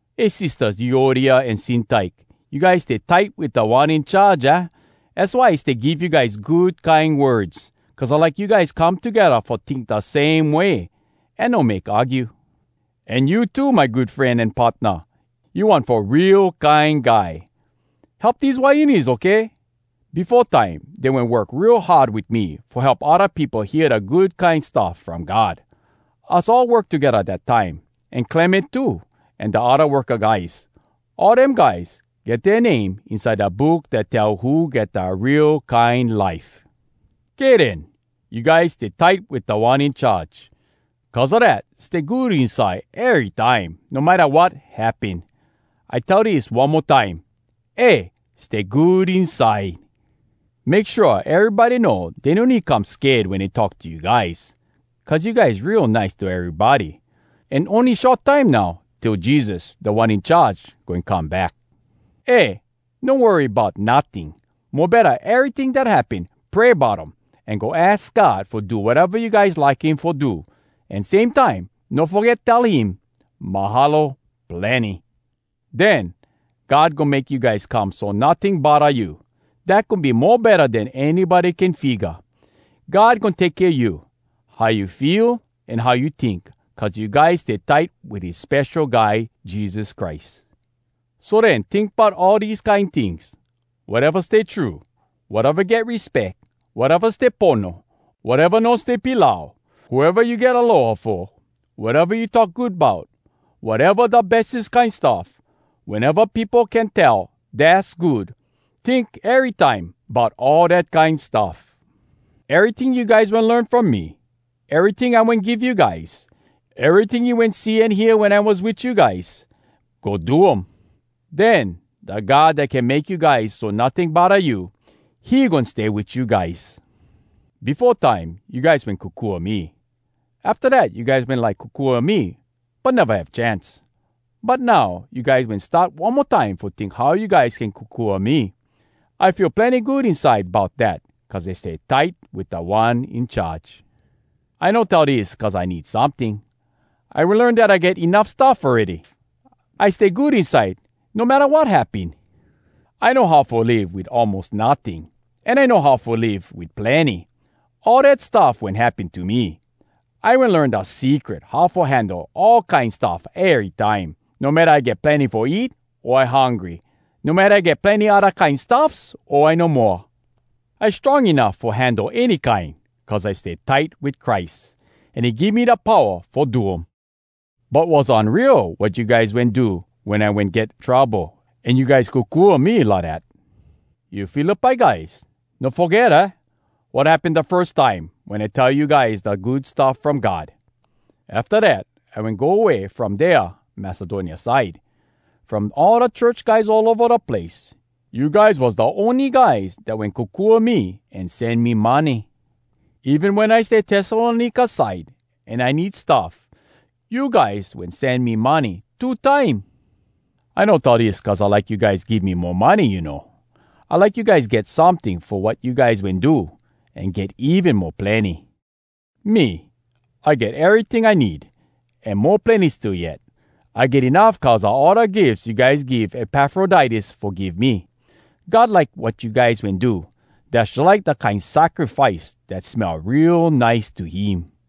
Eh sistahs, Euodia an Syntyke! You guys stay tight wit Da One In Charge, aah? Az why I stay give you guys good kine words, cuz I like you guys come togedda fo tink da same way, an no make argue. An you too, my good fren an partna, you one fo real kine guy! Help dese wahines, okay? Befo time dey wen work real hard wit me fo help odda peopo hear da Good Kine Stuff From God. Us all work togedda dat time, an Clement too, an da odda worka guys. All dem guys get dea name inside da Book Dat Tell Who Get Da Real Kine Life. Kay den. You guys stay tight wit Da One In Charge. Cuz a dat, stay good inside erytime, no matta wat happen! I like tell dis one mo time: Eh! Stay good inside! Make shua erybody know dey no need come sked wen dey talk to you guys, cuz you guys real nice to erybody. An ony short time now till Jesus, Da One In Charge, goin come back. Eh, no worry bout notting! Mo betta, eryting dat happen, pray bout um, an go aks God fo do wateva you guys like him fo do. An same time, no foget tell him, “Mahalo plenny!” Den, God goin make you guys come so notting bodda you. Dat goin be mo betta den anybody can figga. God goin take kea you, how you feel an how you tink, cuz you guys stay tight wit his Spesho Guy Jesus Christ. So den, tink bout all dese kine tings—wateva stay true, wateva get respeck, wateva stay pono, wateva no stay pilau, whoeva you get aloha fo, wateva you talk good bout, wateva da bestes kine stuff, weneva peopo can tell, “Dass good!”—tink erytime bout all dat kine stuff. Eryting you guys wen learn from me, eryting I wen give you guys, eryting you wen see an hear wen I was wit you guys—go do um! Den, da God dat can make you guys so notting bodda you, he goin stay wit you guys. Befo time, you guys wen kokua me. Afta dat, you guys wen like kokua me, but neva have chance. But now, you guys wen start one mo time fo tink how you guys can kokua me. I feel plenny good inside bout dat cuz I stay tight wit Da One In Charge. I no tell dis cuz I need someting. I wen learn dat I get enuff stuff awready. I stay good inside no matta wat happen. I know how fo live wit almos notting, an I know how fo live wit plenny. All dat stuff wen happen to me. I wen learn da secret how fo handle all kine stuff erytime. No matta I get plenny fo eat, o I hungry. No matta I get plenny odda kine stuffs, o I no moa. I strong enuff fo handle any kine cuz I stay tight wit Christ, an he give me da powa fo do um. But was unreal wat you guys wen do wen I wen get trouble an you guys kokua me lidat. You Philippi guys, you no foget, aah? wat happen da firs time, wen I tell you guys da Good Stuff From God. Afta dat, I wen go way from dea Macedonia side. From all da church guys all ova da place, you guys was da ony guys dat wen kokua me an sen me money. Even wen I stay Tessalonika side an I need stuff, you guys wen sen me money two time. I no tell dis cuz I like you guys give me mo money, you know. I like you guys get someting fo wat you guys wen do, an get even mo plenny. Me, I get eryting I need, an mo plenny still yet. I get enuff cuz a all da gifs you guys give Epafroditus fo give me. God like wat you guys wen do. Dass jalike da kine sacrifice dat smell real nice to him.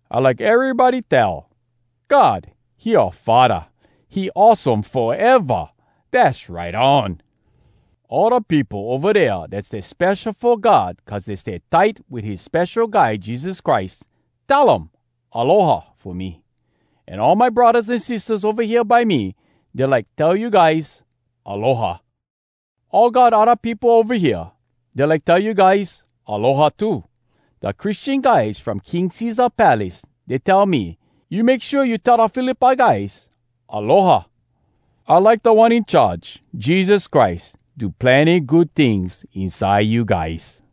I like erybody tell: “God, he oua Faddah. He awesome foeva! Dass right on!” All da peopo ova dea dat stay spesho fo God cuz dey stay tight wit his Spesho Guy Jesus Christ, tell um “Aloha!” fo me. An all my braddahs an sistahs ova hea by me, dey like tell you guys “Aloha!” All God odda peopo ova hea, dey like tell you guys “Aloha!” too. Da Christian guys from King Cesar palace, dey tell me, “You make shua you tell da Philippi guys ‘Aloha!’” I like Da One In Charge, Jesus Christ, do plenny good tings inside you guys.